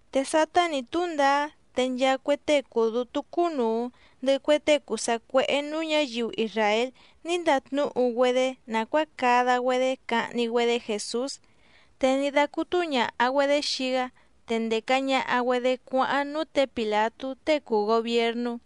Te sátá nǐ túndaá te nchaa cue tée cùu dútú cúnùu, ndɨhɨ cue tée cùu sacuéhé nǔú ñǎyiu isràél ní ndatnúhu‑güedé nàcuáa cada‑güedé cahni‑güedé Jèsús. Te ní dácútú ñàha‑güedé xii‑gá, te ndèca ñaha‑güedé cuáháⁿ núú tě Pìlatú tée cùu gobiernú.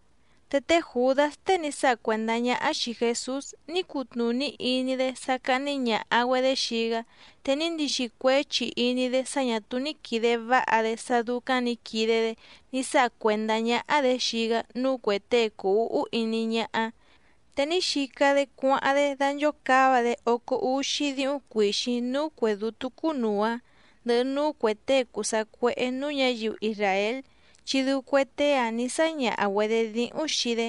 Te té Jùdás tée ní sáha cuèndá ñáhá xìi Jesús ní cutnùní iní‑dé sá cáhní ñàha‑güedé xii‑gá, te ní ndixi cuéchi iní‑dé sá ñà túú ní quìde váha‑dé sá dúcáⁿ nǐ quide‑dé ní sáha cuèndá ñáhá‑dě xii‑gá núú cuè tée cùu úhú iní ñáhá, te ní xica‑dé cuáháⁿ‑dé danchòcáva‑dé ócó úxí díhúⁿ cuìxíⁿ núú cuè dútú cúnùu‑áⁿ, ndɨhɨ núú cuè tée cùu sacuéhé nǔú ñǎyiu isràél, chi dɨu cue tée‑áⁿ nǐ sáñaha‑güedě díhúⁿ xii‑dé.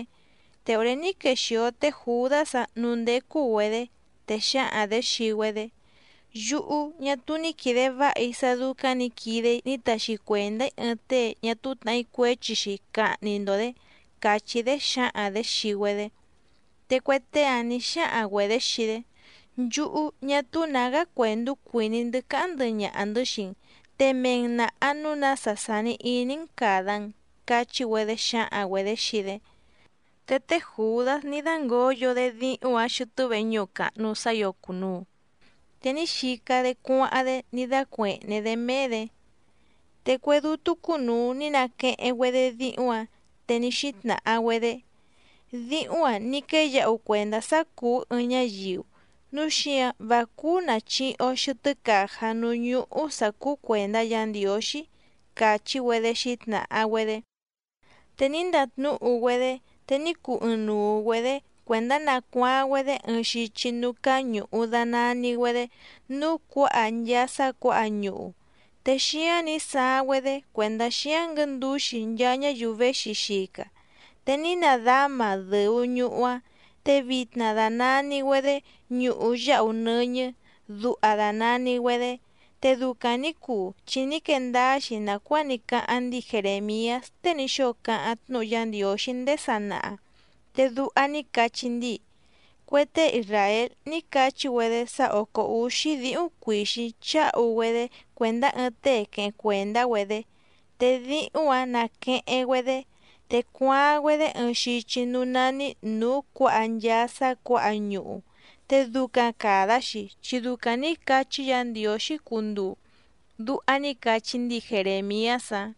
Te òré ní quexìo té Jùdás‑áⁿ nǔú ndécú‑güedě, te xǎhaⁿ‑dě xii‑güedé: —Yúhú, ñá túú ní quìde váha‑í sá dúcáⁿ nǐ quide‑í ní taxi cuèndá‑í ɨɨⁿ tée ñá túú tnàhí cuéchi‑xi cahni‑ndo‑dě —càchí‑dé xǎhaⁿ‑dě xii‑güedé. Te cue tée‑áⁿ nǐ xáhaⁿ‑güedě xii‑dé: —Nchúhú, ñá túú nǎgá cuèndú cuìní‑ndɨ́ cáháⁿ ndɨhɨ ñaha‑ndɨ̌ xii‑n, te mee‑n nàha núu nása sàni iní‑n càda‑n —cachí‑güedé xǎhaⁿ‑güedě xii‑dé. Te té Jùdás ní dǎngoyo‑dé díhúⁿ‑ǎⁿ xɨtɨ́ veñúhu càhnu sá ǐo cùnuu, te ní xica‑dé cuáháⁿ‑dé ní dácuèhné‑dé méé‑dě. Te cue dútú cúnùu ní naqueheⁿ‑güedé díhúⁿ‑ǎⁿ, te ní xítnàha‑güedé: —Díhúⁿ‑a ní quéyǎhu cuèndá sá cùú ɨɨⁿ ñáyiu, núu xíǎⁿ vá cúú nàchihi‑o xɨtɨ́ càjá núú ñúhú sǎ cúú cuèndá Yǎ Ndiǒxí —càchí‑güedé xǐtnàha‑güedé. Te ní ndatnúhu‑güedé te ní cuu ɨɨⁿnuu‑güedě cuèndá nacuaaⁿ‑güedé ɨɨⁿ xichi núú cáá ñùhu danani‑güedé Núú Cuǎha Nchaa Sá Cuǎha Ñuhu, te xíáⁿ nǐ saaⁿ‑güedé cuèndá xíáⁿ nguɨ̌ndǔxi nchaa ñáyiu véxi xica. Te ní nadáma dɨ̀u ñuhu‑áⁿ, te vitna dànani‑güedé Ñuhu Yáhu Nɨ́ñɨ́, duha dànani‑güedé. Te ducaⁿ nǐ cuu chi ní quee ndáá‑xi nàcuáa ní cáháⁿ ndíi Jerèmiás tée ní xóo cáháⁿ tnúhu Yá Ndiǒxí ndéé sanaha, te duha ní cachí ndíi: “Cue tée isràél ní cachí‑güedé sá òcó úxí díhúⁿ cuìxíⁿ cháhu‑güedé cuèndá ɨɨⁿ tée queheⁿ cuèndá‑güedé. Te díhúⁿ‑ǎⁿ nàqueheⁿ‑güedé, te cuaaⁿ‑güedé ɨɨⁿ xichi núú nání Nǔú Cuǎha Nchaa Sá Cuǎha Ñuhu, te ducaⁿ càda‑xi chi ducaⁿ nǐ cachí Yǎ Ndiǒxí cunduu”, duha ní cachí ndíi Jerèmiás‑áⁿ.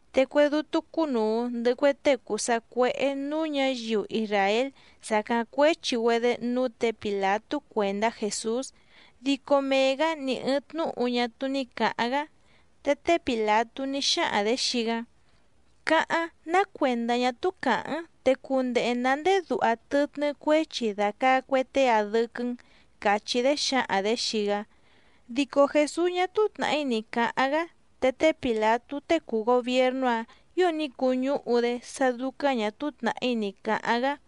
Te cue dútú cúnùu ndɨhɨ cue tée cùu sacuéhé nǔú ñǎyiu isràél sàcáⁿ cuéchi‑güedé núú tě Pìlatú cuèndá Jèsús, dico mee‑gǎ ni ɨ̀ɨⁿ tnúhu ñá túú ní cǎháⁿ‑gá. Te té Pìlatú ní xáhaⁿ‑dě xii‑gá: —Cáháⁿ, ná cuèndá ñá túú càháⁿ‑n, te cundehe nǎ ndéé duha tɨtnɨ́ cuéchi dàcaa cue tée‑a dɨ́quɨ́‑n —càchí‑dé xǎhaⁿ‑dě xii‑gá. Dico Jèsús ñá túú tnàhí ni cǎháⁿ‑gá, te té Pìlatú tée cùu gobiernú‑áⁿ ǐo ní cuñúhu‑dé sá dúcáⁿ ñà túú tnàhí ni cǎháⁿ‑gá.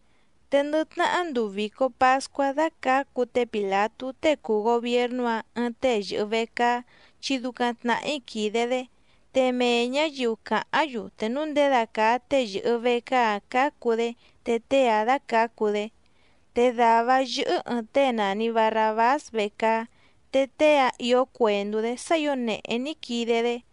Te ndɨ tnahá nduu vìco pascuá dácǎcu té Pìlatú tée cùu gobiernú‑áⁿ ɨɨⁿ tée yɨ̀hɨ vecaá chi ducaⁿ tnàhí quìde‑dé, te mee ñǎyiu càháⁿ‑yu te núu ndědacàa tée yɨ̀hɨ vecaá‑áⁿ cǎcu‑dé te tée‑áⁿ dácǎcu‑dé. Te dàvá‑áⁿ yɨ́hɨ́ ɨ̀ɨⁿ tée nàni Barrabás vecaá, te tée‑áⁿ ìó cuèndú‑dé sá ǐo nèhé ní quide‑dé.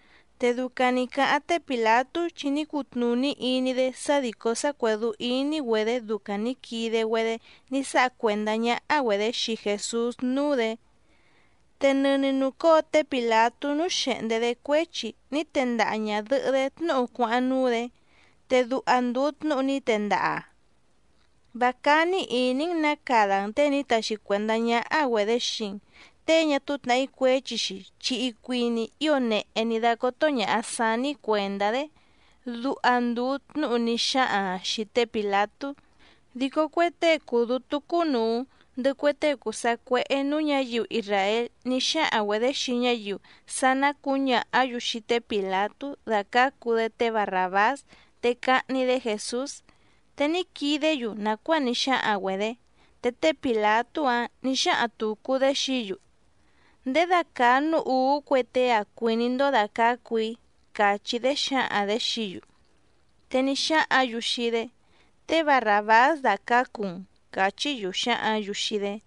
Te ducaⁿ nǐ cáháⁿ té Pìlatú, chi ní cutnùní iní‑dé sá dìcó sá cuèdú íní‑güedě ducaⁿ nǐ quide‑güedé ní sáha cuèndá ñáhá‑güedě xii Jèsús núú‑dě. Te nɨni nùcóo té Pìlatú núú xèhndé‑dé cuéchi ní tendaha ñàdɨhɨ́‑dé tnúhu cuáháⁿ núú‑dě, te duha ndùu tnúhu ní tendaha‑aⁿ: “Vá cání ìní‑n nǎ cada‑n těe ní taxi cuèndá ñáhá‑güedě xii‑n, tée ñá túú tnàhí cuéchi‑xi, chi icuini ío nèhé ní dácótó ñàha saní‑í cuèndá‑dé”, duha ndùu tnúhu ní xáhaⁿ‑aⁿ xìi té Pìlatú. Dico cue tée cùu dútú cúnùu, ndɨhɨ cue tée cùu sacuéhé nǔú ñǎyiu isràél ní xáhaⁿ‑güedě xii ñáyiu sá ná cǔñàhá‑yu xii té Pìlatú dàcácu‑dé té Barràbás te cahni‑dé Jèsús, te ní quidé‑yu nàcuáa ní xáhaⁿ‑güedě. Te té Pìlatú‑áⁿ nǐ xáhaⁿ tùcu‑dé xií‑yu: —¿Ndědacàa núú ùú cue tée‑a cuìní‑ndó dàcácu‑í? —càchí‑dé xǎhaⁿ‑dě xií‑yu. Te ní xáhǎⁿ‑yu xii‑dé: —Té Barràbás dàcácu‑n —càchí‑yu xǎhǎⁿ‑yu xii‑dé.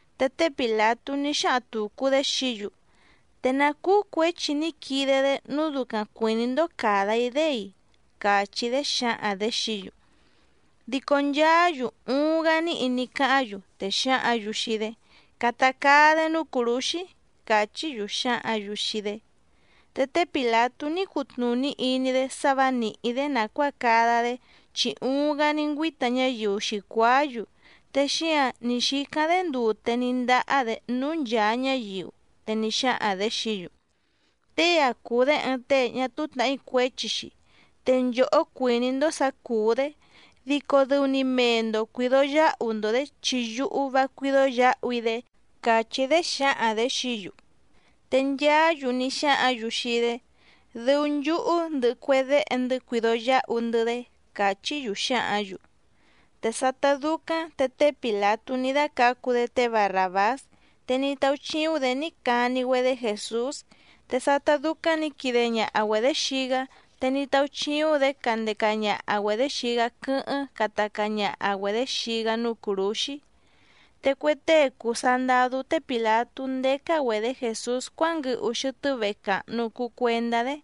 Te té Pìlatú ní xáhaⁿ tùcu‑dé xií‑yu: —¿Te ná cúú cuěchi ní quide‑dé nǔu ducaⁿ cuìní‑ndó càda‑í‑dé‑i? —càchí‑dé xǎhaⁿ‑dě xií‑yu. Dico nchaá‑yu uuⁿ‑gá níhi ní cáháⁿ‑yu, te xǎhǎⁿ‑yu xii‑dé: —¡Cata caa‑dé núú cùrúxí! —càchí‑yu xǎhǎⁿ‑yu xii‑dé. Te té Pìlatú ní cutnùní iní‑dé sá vǎ nìhí‑dé nàcuáa cada‑dé, chi uuⁿ‑gá ní ngüíta ñáyiu xǐcuáá‑yu, te xíǎⁿ ní xícáⁿ‑dé ndute ní ndáhá‑dě núú nchàa ñáyiu, te ní xáhaⁿ‑dě xií‑yu: —Tée‑a cùu‑dé ɨɨⁿ tée ñá túú tnàhí cuéchi‑xi, te nchòhó cuìní‑ndó sǎ cùú‑dé, dico dɨu‑ni mee‑ndo cuìdo yáhu‑ndo‑dě chi yúhú vá cuídó yǎhu‑í‑dé —càchí‑dé xǎhaⁿ‑dě xií‑yu. Te nchaá‑yu ní xáhǎⁿ‑yu xii‑dé: —¡Dɨu nchúhú ndɨhɨ cue déhe‑ndɨ́ cuido yǎhu‑ndɨ́‑dé! —càchí‑yu xǎhǎⁿ‑yu. Te sátá dúcáⁿ te té Pìlatú ní dácǎcu‑dé té Barràbás, te ní táúchíúⁿ‑dě ní cani‑güedé Jèsús. Te sátá dúcáⁿ nǐ quide ñaha‑güedě xii‑gá, te ní táúchíúⁿ‑dě candeca ñaha‑güedě xii‑gá quɨ́hɨ́ⁿ cata caa ñaha‑güedě xii‑gá núú cùrúxí. Te cue tée cùu sandadú té Pìlatú ndécá‑güedě Jèsús cuánguɨhu xɨtɨ́ vehe càhnu cuu cuendá‑dé,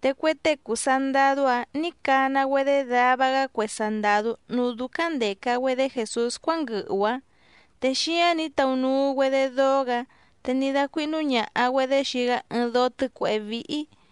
te cue tée cùu sandadú‑áⁿ nǐ cana‑güedé dava‑gá cue sandàdú núú dúcáⁿ ndèca‑güedé Jèsús cuánguɨhu‑áⁿ. Te xíáⁿ nǐ taunuu‑güedé dóó‑gǎ, te ní dácuíhnú ñàha‑güedé xii‑gá ɨɨⁿ dóó tɨ́cuèhé víhí.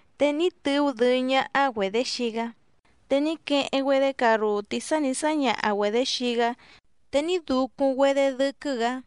Te ní tɨú dɨɨ́ ñáhá‑güedě xii‑gá, te ní queheⁿ‑güedé carrùtí sá nǐ sáñaha‑güedě xii‑gá te ní ducuⁿ‑güedé dɨ́quɨ́‑gǎ.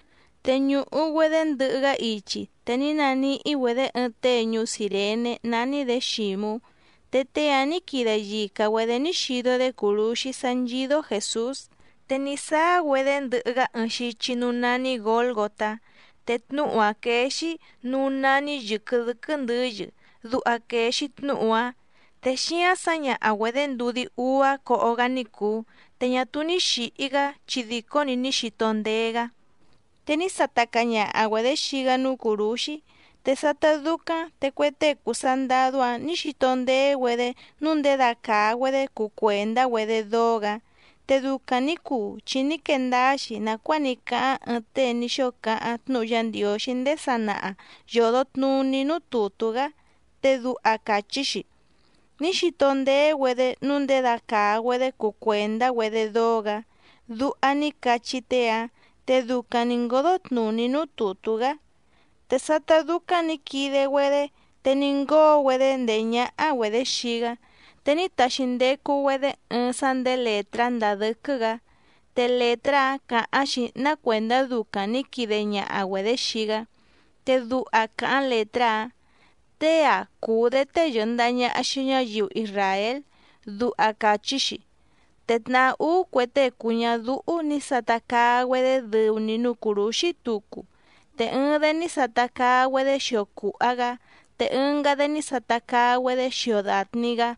Te ñùhu‑güedé ndɨhɨ‑gá ichi, te ní naníhí‑güedě ɨɨⁿ tée ñuú Cìrené nání‑dě Xǐmú, te tée‑áⁿ nǐ quide yica‑güedě ní xido‑dé cùrúxí sá nchídó Jèsús. Te ní sáá‑güedé ndɨhɨ‑gá ɨɨⁿ xichi núú nání Gǒlgotá, te tnúhu‑áⁿ quéé‑xí: Núú nání yɨ̀quɨ dɨ́quɨ́ ndɨ̌yɨ, duha quèe‑xi tnúhu‑áⁿ. Te xíáⁿ sǎñaha‑güedě ndudí úá coho‑gá ní cùu, te ñá túú ní xìhi‑gá chi dico‑ni ní xito ndéé‑gá. Te ní sata caa ñaha‑güedě xii‑gá núú cùrúxí, te sátá dúcáⁿ te cue tée cùu sandadú‑áⁿ nǐ xito ndéé‑güedé nǔu ndědacàa‑güedé cuu cuèndá‑güedé dóó‑gǎ. Te ducaⁿ nǐ cuu chi ní quee ndáá‑xi nàcuáa ní cáháⁿ ɨɨⁿ tée ní xóo cáháⁿ tnúhu Yá Ndiǒxí ndéé sanaha yòdo tnuní núú tùtú‑gá, te duha càchí‑xi: “Ní xito ndéé‑güedé nǔu ndědacàa‑güedé cuu cuèndá‑güedé dóó‑gǎ”, duha ní cachí tée‑áⁿ te ducaⁿ nǐ ngódó tnùní núú tùtú‑gá. Te sátá dúcáⁿ nǐ quide‑güedé, te ní ngóo‑güedé ndèé ñáhá‑güedě xii‑gá. Te ní taxi ndecu‑güedé ɨɨⁿ sá ndèé lètrá ndàa dɨ́quɨ́‑gǎ. Te lètrá‑áⁿ càháⁿ‑xi ná cuèndá ducaⁿ nǐ quide ñaha‑güedě xii‑gá, te duha càháⁿ lètrá‑áⁿ: “Tée‑a cùu‑dé tée yɨ̀ndaha ñaha xii ñáyiu isràél”, duha càchí‑xi. Te tnàhá úú cue tée cùu ñadúhú nǐ sata caa‑güedé dɨu‑ni núú cùrúxí tucu, te ɨɨⁿ‑dé ní sata caa‑güedé xio cùha‑gá, te ɨngá‑dé ní sata caa‑güedé xio dàtni‑gá.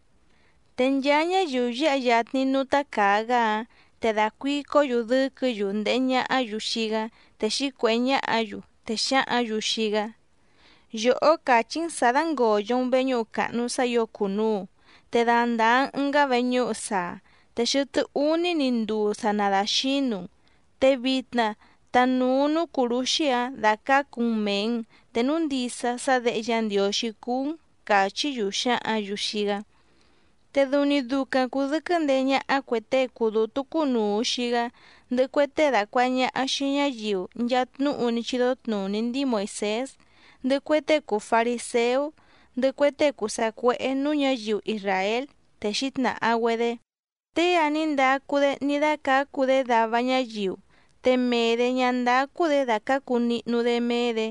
Te nchaa ñáyiu yǎha yatni núú tácàa‑gá‑áⁿ, te dàcuicó‑yu dɨ́quɨ̌‑yu ndèhe ñahá‑yu xii‑gá, te xǐcuèhé ñáhǎ‑yu. Te xǎhǎⁿ‑yu xii‑gá: —Yòhó càchí‑n sǎ dàngoyo‑n veñúhu càhnu sá ǐo cùnuu, te dandàa‑n ɨngá veñúhu saa, te xɨtɨ́ úní‑ni nduu sa nadaxǐnu‑n, te vitna tanùu núú cùrúxí‑áⁿ dàcácu‑n mèe‑n te núu ndisa sá Děhe Yá Ndiǒxí cúú‑n —càchí‑yu xǎhǎⁿ‑yu xii‑gá. Te dɨu‑ni ducaⁿ cùdɨquɨ́ ndeé ñáhá cuè tée cùu dútú cúnùu xii‑gá, ndɨhɨ cue tée dàcuaha ñaha xii ñáyiu nchaa tnúhu ní chídó tnùní ndíi Moìsés, ndɨhɨ cue tée cùu fariséú, ndɨhɨ cue tée cùu sacuéhé nǔú ñǎyiu isràél, te xǐtnàha‑güedé: —Tée‑a ní ndacu‑dé ní dácǎcu‑dé dava ñáyiu, te mee‑dě ñá ndácú‑dě dàcácu nihnu‑dé méé‑dě.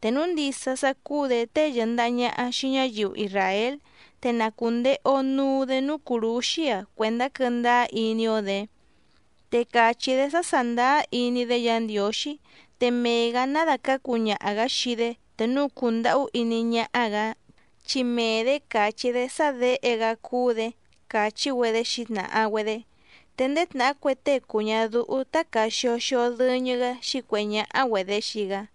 Te núu ndisa sá cúú‑dě tée yɨ̀ndaha ñaha xii ñáyiu isràél, te na cùndehe‑o nuu‑dé núú cùrúxí‑a cuèndá quɨ́ndáá iní‑ó‑dě. Te càchí‑dé sá sàndáá iní‑dé Yǎ Ndiǒxí, te mee‑gǎ ná dàcácu ñaha‑gǎ xii‑dé te núu cùndahú iní ñáhá‑gǎ, chi mee‑dě càchí‑dé sá Děhe‑gá cúú‑dě —càchí‑güedé xǐtnàha‑güedé. Te ndéé tnàhá cue tée cùu ñadúhú tácàa xio xio dɨñɨ‑gá xǐcuèhé ñáhá‑güedě xii‑gá.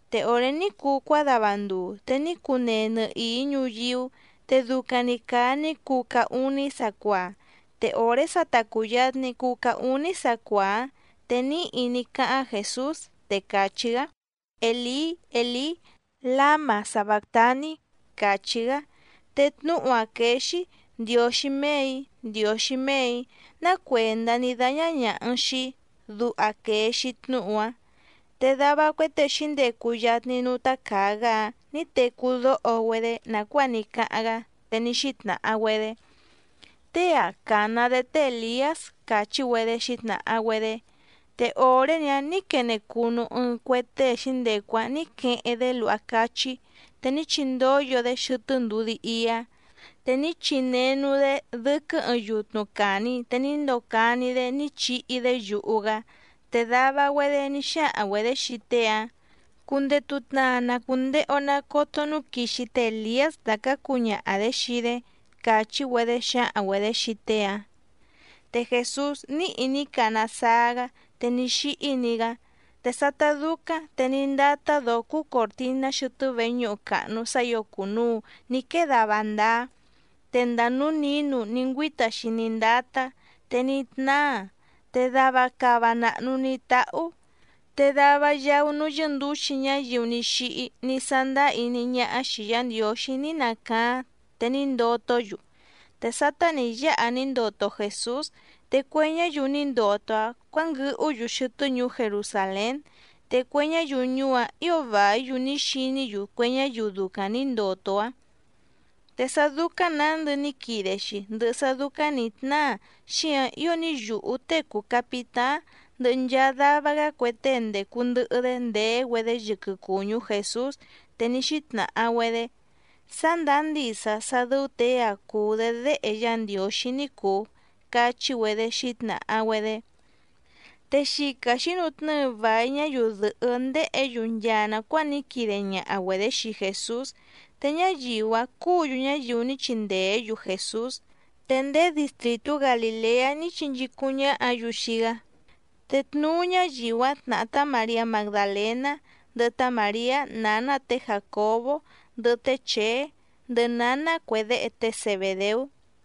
Te òré ní cuu cuádava nduu te ní cunee nɨhìí ñuyíú, te ducaⁿ‑ni càa ní cuu caá úní sacuaa. Te òré sa ta cùyatni cuu caá úní sacuaa‑áⁿ, te níhi ní cáháⁿ Jèsús, te càchí‑gá: —Èlí, Èlí, ¿láma sabàctaní? —càchí‑gá. Te tnúhu‑áⁿ quéé‑xí: Ndiǒxí méè‑í, Ndiǒxí méè‑í, ¿ná cuèndá ní dáñá ñàha‑n xii‑í?, duha quèe‑xi tnúhu‑áⁿ. Te dava cue tée xǐndecu yatni núú tácàa‑gá‑áⁿ nǐ tecú dóho‑güedé nàcuáa ní cáháⁿ‑gá, te ní xítnàha‑güedé: —Tée‑a càna‑dé té Èliás —càchí‑güedé xǐtnàha‑güedé. Te òré‑ni‑áⁿ nǐ quene cunu ɨɨⁿ cue tée xǐndecu‑áⁿ nǐ queheⁿ‑dé luha cáchí, te ní chindóyo‑dé xɨtɨ́ ndudí íá, te ní chinenu‑dé dɨ́quɨ́ ɨɨⁿ yutnu càni te ní ndocani‑dé ní chihi‑dé yuhu‑gá. Te dava‑güedé ní xáhaⁿ‑güedě xii tée‑áⁿ: —Cundetu tnaa na cùndehe‑o nacoto núu quixi té Èliás dàcácu ñaha‑dě xii‑dé —càchí‑güedé xǎhaⁿ‑güedě xii tée‑áⁿ. Te Jèsús níhi ní cana saa‑gá, te ní xíhí‑ni‑gá. Te sátá dúcáⁿ te ní ndátá dǒó cúú còrtiná xɨtɨ́ veñúhu càhnu sá ǐo cùnuu ní quée dava ndáá, te ndàa núú nǐnu ní ngüíta‑xi ní ndátá, te ní tnáa, te dava cava nàhnu ní táhú. Te dava yaú núú yɨ́ndǔxi ñáyiu ní xíhí ní sándáá iní ñáhá xìi Yá Ndiǒxí ní nacaáⁿ te ní ndotó‑yu. Te sátá nǐ yáha ní ndoto Jèsús, te cue ñáyiu ní ndoto‑áⁿ cuǎnguɨhú‑yu xɨtɨ́ ñuú Jerusàlén, te cue ñáyiu ñuú‑áⁿ ǐo vàí‑yu ní xiní‑yu cue ñáyiu ducaⁿ nǐ ndoto‑áⁿ. Te sá dúcáⁿ nǎndɨ ní quide‑xi, ndɨhɨ sá dúcáⁿ nǐ tnáa xíǎⁿ ío ní yùhú tée cùu capitáⁿ ndɨhɨ nchaa dava‑gá cue tée ndècu ndɨhɨ‑dé ndèé‑güedé yɨquɨ cùñú Jèsús, te ní xítnàha‑güedé: —Sá ndàá ndisa sá dɨ́ú těe‑a cùu‑dé Déhe Yá Ndiǒxí ní cùu —cachí‑güedé xǐtnàha‑güedé. Te xica xǐnutnɨ́ɨ vài ñáyiu dɨ̀hɨ́ ndéhě‑yu nchaa nàcuáa ní quide ñaha‑güedě xii Jèsús, te ñáyiu‑áⁿ cúǔ‑yu ñáyiu ní chindèé‑yu Jèsús, te ndéé distrìtú Galìleá ní chinchícúⁿ ñáhǎ‑yu xii‑gá. Te tnuú ñáyiu‑áⁿ tnàhá tá Màriá Magdalèná, ndɨhɨ tá Màriá nǎná tě Jàcobó ndɨhɨ té Chèé, ndɨhɨ nǎná cue déhe té Zebèdeú.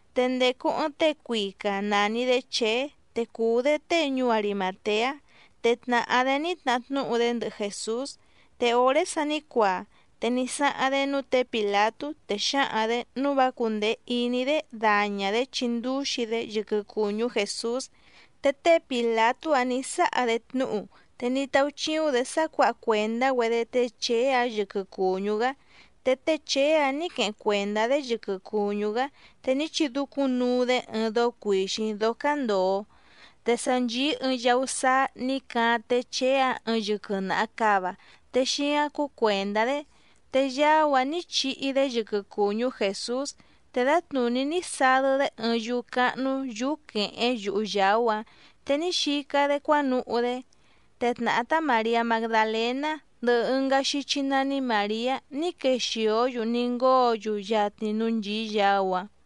Te ndècu ɨɨⁿ tée cuica nàni‑dé Chèé te cùu‑dé tée ñuú Arimàteá, te tnàhá‑dé ní tnahá tnúhu‑dé ndɨhɨ Jèsús. Te òré sa ní cuaa, te ní sáháⁿ‑dé núú tě Pìlatú, te xǎhaⁿ‑dě nǔu vá cúndèe iní‑dé daña‑dě chindúxi‑dé yɨquɨ cùñú Jèsús. Te té Pìlatú‑áⁿ nǐ sáha‑dé tnúhu, te ní táúchíúⁿ‑dě sá cuǎha cuèndá‑güedé té Chèé‑áⁿ yɨquɨ cùñú‑gá. Te té Chèé‑áⁿ nǐ queheⁿ cuèndá‑dé yɨquɨ cùñú‑gá, te ní chidúcúⁿnuu‑dé ɨɨⁿ dóó cuìxíⁿ dóó cándòo. Te sa nchìí ɨɨⁿ yaú sáá nǐ caáⁿ té Chèé‑áⁿ ɨɨⁿ yɨquɨ naha càva te xíáⁿ cúú cuèndá‑dé, te yaú‑áⁿ nǐ chihi‑dé yɨquɨ cùñú Jèsús, te dǎtnùní ní sadɨ́‑dé ɨɨⁿ yúú cáhnú yǔú quèhéⁿ yuhu yàú‑áⁿ, te ní xica‑dé cuánuhú‑dé. Te tnàhá tá Màriá Magdalèná, ndɨhɨ ɨngá xíchí nání Màriá ní quexìó‑yu ní ngóo‑yu yatni núú nchìí yaú‑áⁿ.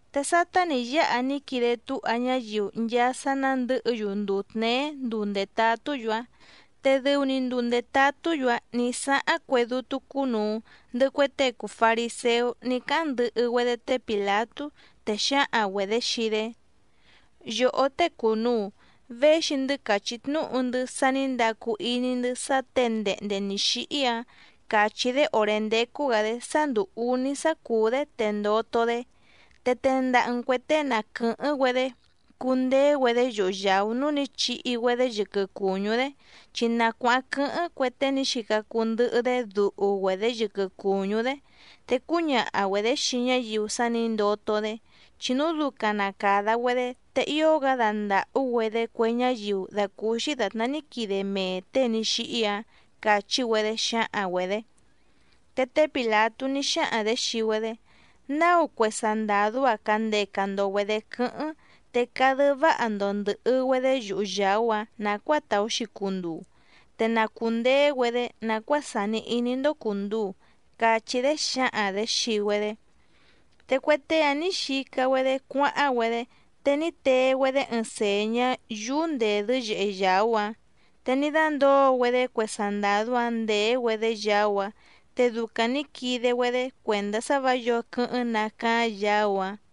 Te sátá nǐ yáha ní quide túha ñáyiu nchaa sá nándɨ̌hɨ‑yu nduu tněé nduu ndètatú‑yu‑áⁿ, te dɨu‑ni nduu ndètatú‑yu‑áⁿ nǐ sáháⁿ cue dútú cúnùu, ndɨhɨ cue tée cùu fariséú ní cáháⁿ ndɨhɨ‑güedé té Pìlatú. Te xǎhaⁿ‑güedě xii‑dé: —Yòhó tée cùnuu, véxi‑ndɨ́ càchí tnúhu‑ndɨ́ sá nǐ ndacu iní‑ndɨ́ sá těe ndehnde nǐ xíhí‑ǎⁿ càchí‑dé òré ndécú‑gǎ‑dé sá ndùu úní sá cùú‑dé, te ndoto‑dé. Te tendaha‑n cuè tée na quɨ̀hɨ́ⁿ‑güedé cundeé‑güedé yuhu yàú núú nǐ chihi‑güedé yɨquɨ cùñú‑dé, chi na cuáháⁿ quɨ́hɨ́ⁿ cue tée ní xica cuu ndɨhɨ‑dé duhu‑güedě yɨquɨ cùñú‑dé, te cúñaha‑güedě xii ñáyiu sá nǐ ndoto‑dé. Chi núu ducaⁿ na càda‑güedé te ío‑gá dandàhú‑güedé cue ñáyiu dàcúúxí dàtná ní quide mee těe ní xíhí‑ǎⁿ —càchí‑güedé xǎhaⁿ‑güedě. Te té Pìlatú ní xáhaⁿ‑dě xii‑güedé: —Náu cue sandàdú‑a candeca‑ndo‑güedě quɨ́hɨ́ⁿ, te cadɨ́ váha‑ndo ndɨ̀hɨ‑güedé yuhu yàú‑áⁿ nàcuáa tàú‑xi cunduu, te na cùndeé‑güedé nàcuáa sàni iní‑ndó cùnduu —cachí‑dé xǎhaⁿ‑dě xii‑güedé. Te cue tée‑áⁿ nǐ xica‑güedé cuáháⁿ‑güedé, te ní tee‑güedé ɨɨⁿ sèñá yúú ndèdɨ́ yèhe yaú‑áⁿ, te ní dándǒo‑güedé cue sandàdú‑áⁿ ndèé‑güedé yaú‑áⁿ, te ducaⁿ nǐ quide‑güedé cuèndá sá vǎ yǒo quɨ́hɨ́ⁿ nacaáⁿ yaú‑áⁿ.